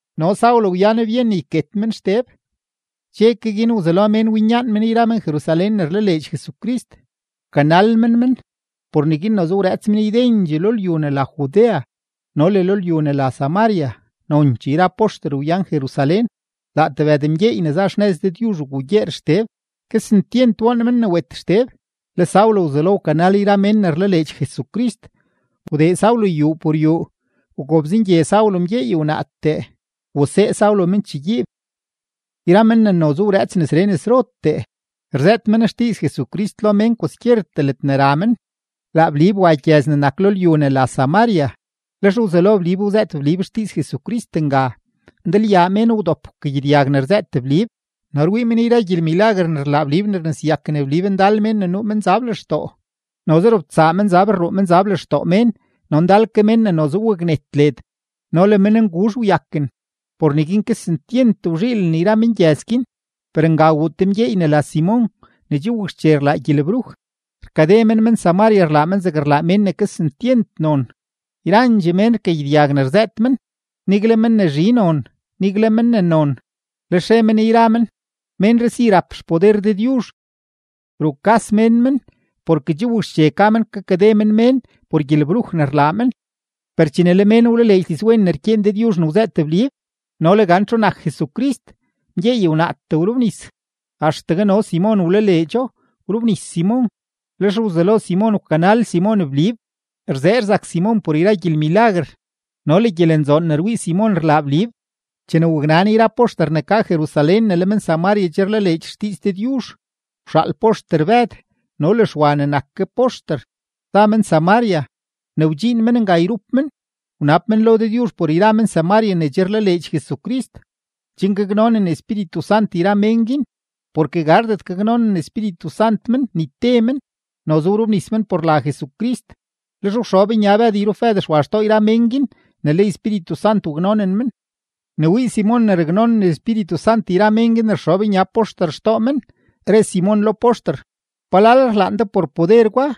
No Saulo wyan byen ne yket men Xteb. Dxe ke guin wzelo mén winyaan men yra men-Jerusalén ne rlaleedx Jesucrist, wkanal men men. Por neguin noze wrëëts men ydendxee lo lyu ne la Judea no le lyu ne la Samaria, nonchee yra poxter wyan Jerusalén. Laa tebëd mgyeey ne za xnëz Dëdyuzh wgugyeer Xteb, kesentyent woon men ne wet Xteb. Le Saulo wzelo wkanal yra mén ne rlaleedx Jesucrist; wdee Saulo yuu por yuu, wgobzengye Saulo mgyeey wnaatee, wasee Saulo men chegyiib. Yra men ne noze wrëëts nesree nesrotee, rzëët men xdiiz Jesucrist lo mén kwaskyertee ledne ra men. Laa Blib wa gyëz ne nak lo lyu ne la Samaria, lex wzelo Blib wzëët Blib xdiiz Jesucrist nga. Ndalyaa mén wdop wkagyedyag ne rzëët Blib no rwii men yra gyelmilaguer ne rlaa Blib ne rneseyaken Blib ndal mén ne nuu menzab lextoo; noze robtsaa menzab rruu men lextoo mén, no ndal ke men ne noze waknet led no le mennguzh wyaken. Por neguin kesentyent wzhiilen yra mengyëz guin. Per nga wuu te mgyeey ne la Simon ne che wakxche rlaa gyelebruj, rkade men men-Samaria, rlaa men zegne rlaa mén ne kesentyent non. Yrandxee mén rkagyedyag ne rzëët men, nigle men ne zhi non, nigle men ne non, lex re men yra men: ―Ménree si rap xpoder Dëdyuzh. Rukas mén men, porke che wakxche ka men kakade men mén por gyelebruj ne rlaa men. Per chene le mén wlaleedx dizwen ne rkyeen Dëdyuzh ne wzëët Blib no le gan txu nak Jesucrist, mgyeey wnaatee wrobnis. Axtegue no Simon wlaleedxo, wrobnis Simon, lex wzelo Simon wkanal Simon Blib, rzee rzak Simon por yra gyelmilaguer no le gyelenzoon ne rwii Simon rlaa Blib. Chene waknan yra poxter ne ka Jerusalén ne le men-Samaria che rlaleedx xdiiz Dëdyuzh, wxaal poxter Bëd no le Xwa ne nak ke poxter, za men Samaria. Ne wdxiin men nga yrup men, wnab men lo Dëdyuzh por yra men-Samaria ne che rlaleedx Jesucrist, chen gaknonen Espíritu Sant yra mén guin. Porke gardet gaknonen Espíritu Sant men ni te men; noze wrobnis men por la Jesucrist. Lex wxob nya Bëd yrup Bëd Xwa xtoo yra mén guin ne le Espíritu Sant waknonen men. Ne wii Simon ne raknonen Espíritu Sant yra mén guin ne rxob nya poxter xtoo men, re Simon lo poxter: ―¿Palal rlaan de por poder gwa?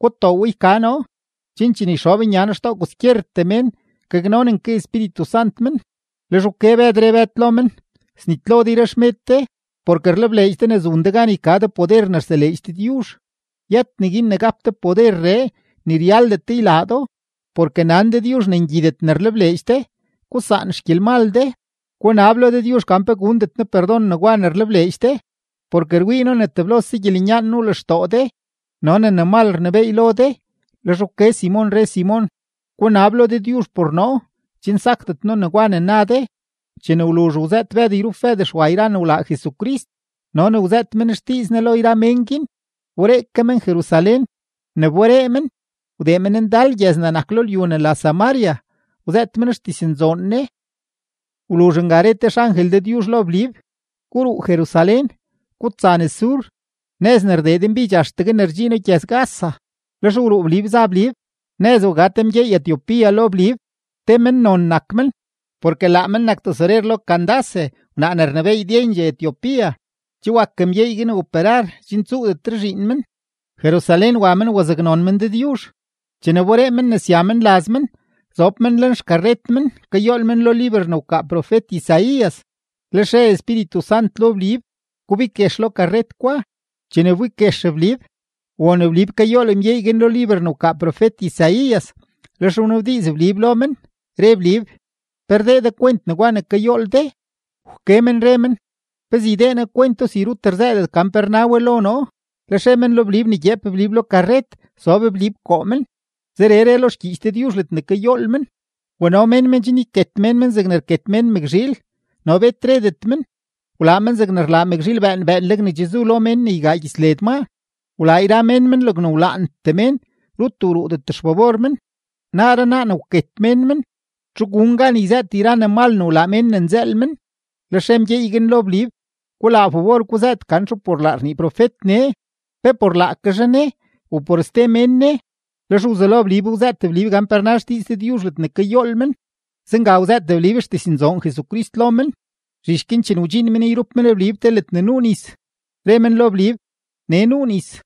Gutoo we yka noo, chen chene yxob nya noo xtoo kwaskyertee mén, gaknonen ke Espíritu Sant men. Lex wke Bëd, re Bëd lo men: ―Snitlo de yra de xmed de, porke rlebleedx de ne zun de gan yka de poder ne rseleedx Dëdyuzh. Yët neguin ne gap de poderree, ni ryaldet de ylaa do, porke nan Dëdyuzh ne ngyidet ne rlebleedx de. Gusaan xgyelmal de, gunab lo Dëdyuzh gan pe gundet Ne perdon negwa ne rlebleedx de. Porke rwii noo ne teblose gyelenyaan nuu lextoo de no ne ne mal rnebééy lo de. Lex wke Simon, re Simon: ―Gunab lo Dëdyuzh por noo, chen sakdet noo negwa ne na de. Chene wluzh wzëët Bëd yrup Bëd Xwa yra ne wlaa Jesucrist no ne wzëët men xdiiz Ne lo yra mén guin, wberee ke men Jerusalén; ne wberee men, wdee men ndal gyëz ne nak lo lyu ne la Samaria, wzëët men xdiznzoon Ne. Wluzh nga re te xangel Dëdyuzh lo Blib: ―Guruu Jerusalén, gutsa nes sur, nëz ne rdee denbidx axtegue ne rdxiino gyëz-Gaza. Lex wruu Blib za Blib; nëz wga te mgyey-Etiopía lo Blib. Te mennon nak men, porke laa men nak tesorer lo Candace wnaa ne rnebééy ydendxee Etiopía. Che wak mgyeey guin operar chen tsuudet zhiin men. Jerusalén wa men wazaknon men Dëdyuzh. Chene wberee men ne sya men laz men, zob men lenxkarret men kayool men lo liber ne wkaa profet-Isaías. Lex re Espíritu Sant lo Blib: ―Gubig guex lo karret gwa. Chene wbig guex Blib, won Blib kayool mgyeey guin lo liber ne wkaa profet-Isaías, lex wnabdiiz Blib lo men, re Blib: ―¿Pe rdee de kwent negwa ne kayool de? Wke men re men: ―¿Pezee ydee noo kwento si rut rzëëdet gan pe rna we lo noo? Lex re men lo Blib ne gyeep Blib lo karret, sob Blib koo men. Zeree re lo xgyiich Dëdyuzh ledne kayool men: Wano mén men chen yket mén men zegne rket mén mëkzhiil, no bet redet men, wlaa men zegne rlaa mëkzhiil bëën bëënleg ne che zu lo mén ne ygaa gyits led maa. Wlaa yra mén men logne wlaantee mén, rut wruudet xfabor men; naaree naa ne wket mén men, ¿txu gun gan yzëët yra ne mal ne wlaa mén ne nzëël men? Lex re mgyeey guin lo Blib: ―Gulaa fabor guzëët gan txu por laa rnii profet nee: ¿pe por laake zhaa ne, u por ste mén ne? Lex wzelo Blib wzëët Blib gan pe rna xdiiz Dëdyuzh ledne kayool men, zenga wzëët Blib xdiznzoon Jesucrist lo men. Zhich guin chene wdxiin men yrup men Blib te ledne nuu nis, re men lo Blib: ―Nee nuu nis;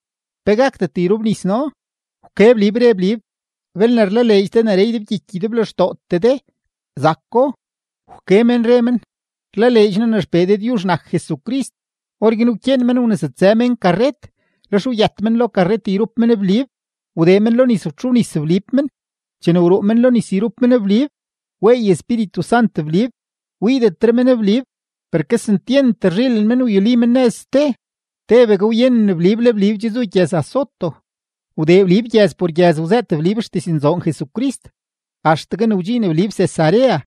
¿pe gakdet yrobnis noo? Wke Blib, re Blib: ―Belne rlaleedx de neree ydebgyiky ydeblextootee de, zako. Wke men re men: ―Rlaleedx noo ne XPee Dëdyuzh nak Jesucrist. Orguin wkyeen men wnesutsë mén karret, lex wyët men lo karret yrup men Blib, wdee men lo nis wtxobnis Blib men. Chene wruu men lo nis yrup men Blib, weey Espíritu Sant Blib, wiidetre men Blib; per kesentyent rzhiilen men wyuli men nëz ste. Tebegue wyenen Blib le Blib che zu gyëz-Azoto, wdee Blib gyëz por gyëz wzëët Blib xdiznzoon Jesucrist, axtegue ne wdxiin Blib Cesarea.